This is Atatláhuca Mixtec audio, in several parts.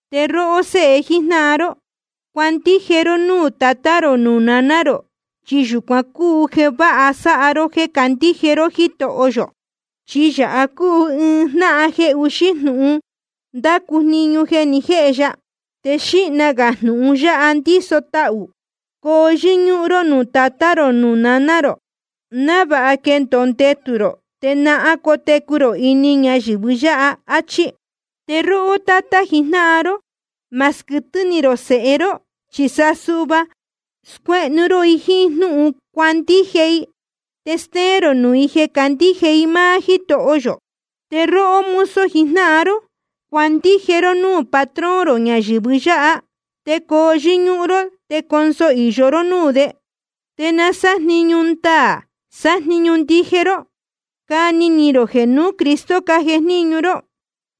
Te róhó séhe jíjnáhan ró, cuandije ró núū tatá rō nuū naná rō, chi yūcuan cúu jeē váha sáha ró jéē candíje ró Jítoho yō. Chi yāha cúu ɨɨn jnáhan jeē uxí jnūhun ndácu jniñu jeē ni jéhe ya, te xīhna gā jnūhun yáha ndíso tahū: Coo yɨ́ñúhún ró nuū tatá rō nuū naná rō, návāha quendōo ndetū rō, te náhán cotecu rō ini ñayɨ̄vɨ yáha. Achí. Te róhó tátá jijnáhan ró, ma squɨtɨ́ ni rō sēhe ró, chi sa suhva scuéhnu ró i jíín jnúhun cuandije i, te stéén rō nuū i jeē candíje i máá Jítoho yō. Te róhó mozo jijnáhan ró, cuandije ró núū patrón rō ñayɨ̄vɨ yáha, te coo yɨ́ñúhún ró te conso īyo ró núū de. Te na sájniñu ndaā sájniñu ndije ró, cani ni rō jeē nuū Cristo cájejníñu ró.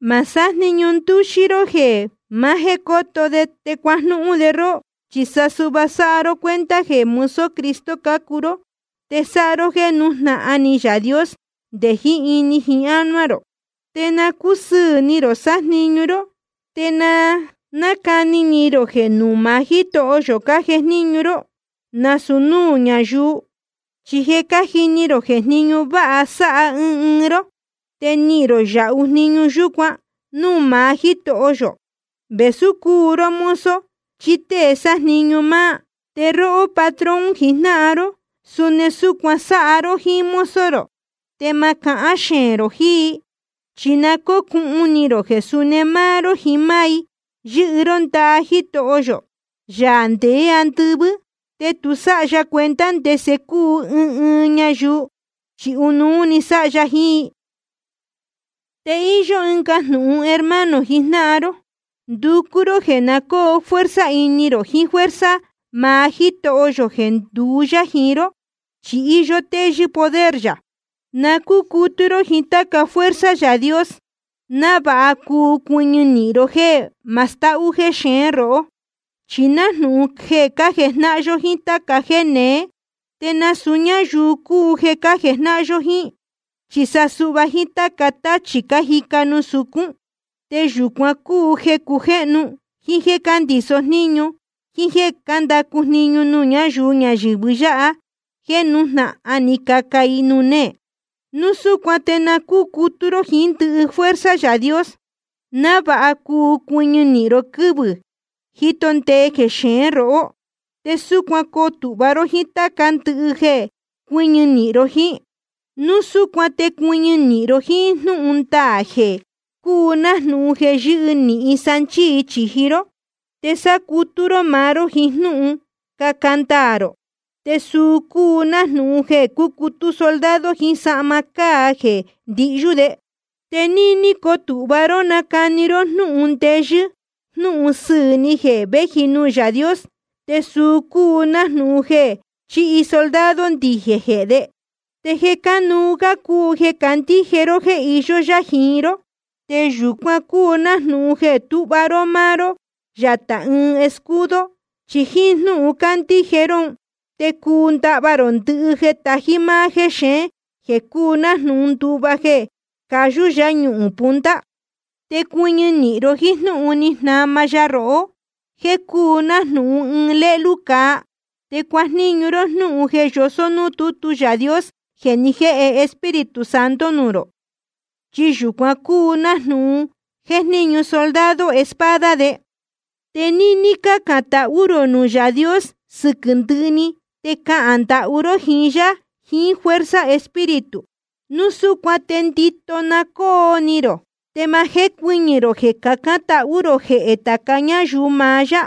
Ma sájniñu ndúxí ró jeē maá jéē coto de te cuajnúhún de róhó. Chi sa suhva sáha ró cuenta jeē mozo Cristo cácuu ró. Te sáha ró jéē nújnahan ni Yaā Dios nde jiín ini jiín ánuá rō. Te na cúsɨɨ̄ ni rō sájniñu ró, te na cáni ni rō jeē nuū maá Jítoho yō cájejníñu ró, nasūu núū ñáyuu. Chi je cájini rō jeē jníñu váha sáha ɨɨn ɨɨn ró, te nihīn rō yāhu jniñu yúcuan núū maá Jítoho yō, vēsú cúu ró mozo chí tée sájniñu máá. Te róhó patrón jijnáhan ró, suni súcuan sáha ró jíín mozo rō, te ma cahán xeēn rō jiín i. Chi na cócuhun ni rō jeē suni máá ró jiín máá i yɨ́hɨ ró ndaha Jitoho yō, Yaā ndeé andɨvɨ́. Te tu sáha ya cuenta ndese cúu ɨɨn ɨɨn ñayuu, chi ɨnuú sáha ya jiín i. Te íyó ɨnga jnūhun, hermano jijnáhan ró. Nducú ró jeē na cóo fuerza ini rō jiín fuerza maá Jítoho yō jeē nduú yá jiín ró, chi íyó téyɨ́ poder yā. Na cúcutú ró jíín táca fuerza Yaā Dios, návāha cuu cuɨñɨ nīhin ró jéē ma stahú jexeén róhó. Chi nájnūhun jeē cájejnáhan yó jíín táca jéē neé. Te nasūu ñáyuu cúu jeē cájejnáhan yó jíín, chi sa suhva jíín táca táchī cájica nuū sucún. Te yūcuan cúu jeē cácujéhnu, jíín jéē cándiso jníñu, jíín jéē cándacu jniñu nuū ñáyuu ñayɨ̄vɨ yáha jeē nájnūhun cájica i nuū néē. Núu súcuan te na cúcutú ró jíín ndɨhɨ fuerza Yaā Dios, návāha cuu cuɨñɨ nīhin ró quɨ́vɨ̄ jíto ndee jexeén rohó. Te súcuan coo tūhva ró jíín táca ndɨhɨ jeē cuɨ́ñɨ nīhin ró jíín. Núu súcuan te cuɨñɨ nīhin ró jíín jnúhun ndaā jeē cúu nájnūhun jeē yɨ́hɨ nīhin sanchíi chīji ró. Te sácutú ró maá ró jiín jnúhun caca ndaā rō, te suu cúu nájnūhun jeē cúcutú soldado jiín sahma cáa jeē ndihyú de. Te níní cotūhva ró nacani ró jnúhun ndeyɨ́ jnūhun sɨɨ̄ ni jeē véji nuū Yaā Dios. Te suu cúu nájnūhun jeē chíhi soldado ndijēn jehē de. Te jeē cánuú gá cúu jeē candíje ró jeē iyó yá jiín ró. Te yūcuan cúu nájnūhun jeē túhva ró máá ró yatā ɨɨn escudo. Chi jíín jnúhun cándíje ró un te cuu ndahva rō ndɨhɨ jeē tají máá jéxeén, jeē cúu nájnūhun nduva jeē cayú yáñuhūn punta. Te cuɨñɨ ró jíín jnúhun ni jnama ya rohó, jeē cúu nájnūhun ɨɨn lélú cāa. Te cuajníñu ró jnúhun jeē yosó núū tútu Yaā Dios jeē ni jéhe Espíritu Santo nuū rō. Chi yūcuan cúu nájnūhun jéjníñu soldado espada de. Te níní cácān tahú rō nuū Yaā Dios sɨquɨ̄ ndɨhɨ‑ni, te cahān ndahú ró jíín yá jiín fuerza Espíritu. Núu súcuan te ndito na cóo ni rō, te ma jécuɨñɨ̄ rō jeē cacán tahú rō jehē tāca ñáyuu maá yá.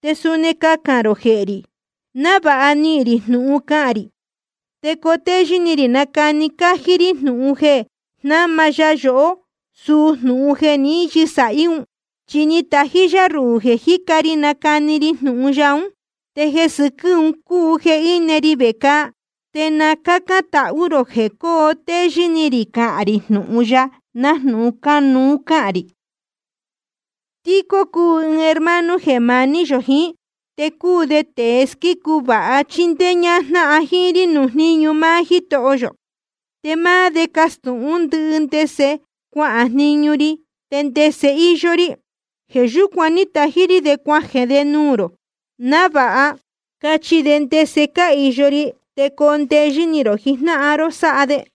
Te suni cahān rō jehē rī, návāha nihīn rī jnūhun cahān rī, te coo téyɨ́ ni rī nacani cájí rí jnūhun jeē jnáma ya yohó, suu jnūhun jeē ní yɨsāhí un. Chi ni tají yá ruhū jeē jíca ri nácani ri jnūhun ya ún, te jeē sɨquɨ́ un cúu jeē íne ri vecāa. Te na cácán tahú rō jeē coo téyɨ́ ni rī cahān rī jnūhun ya, nájnūhun cánuú cahān rī. Tíquico cúu ɨɨn hermano jeē maní yō jiín, te cúu de tēe squícu vāha chíndéé ñájnáhan jíín rí nuū jníñu máá Jítoho yō. Te máá de castūhún ndɨhɨ ndese cuahān jniñu ri te ndese íyó rí. Jeē yúcuan ní tají rí de cuajeē de nuū rō, návāha cachi de ndese cáhīyo ri, te coo ndeyɨ́ ni rō jijnáhan ró sáha de.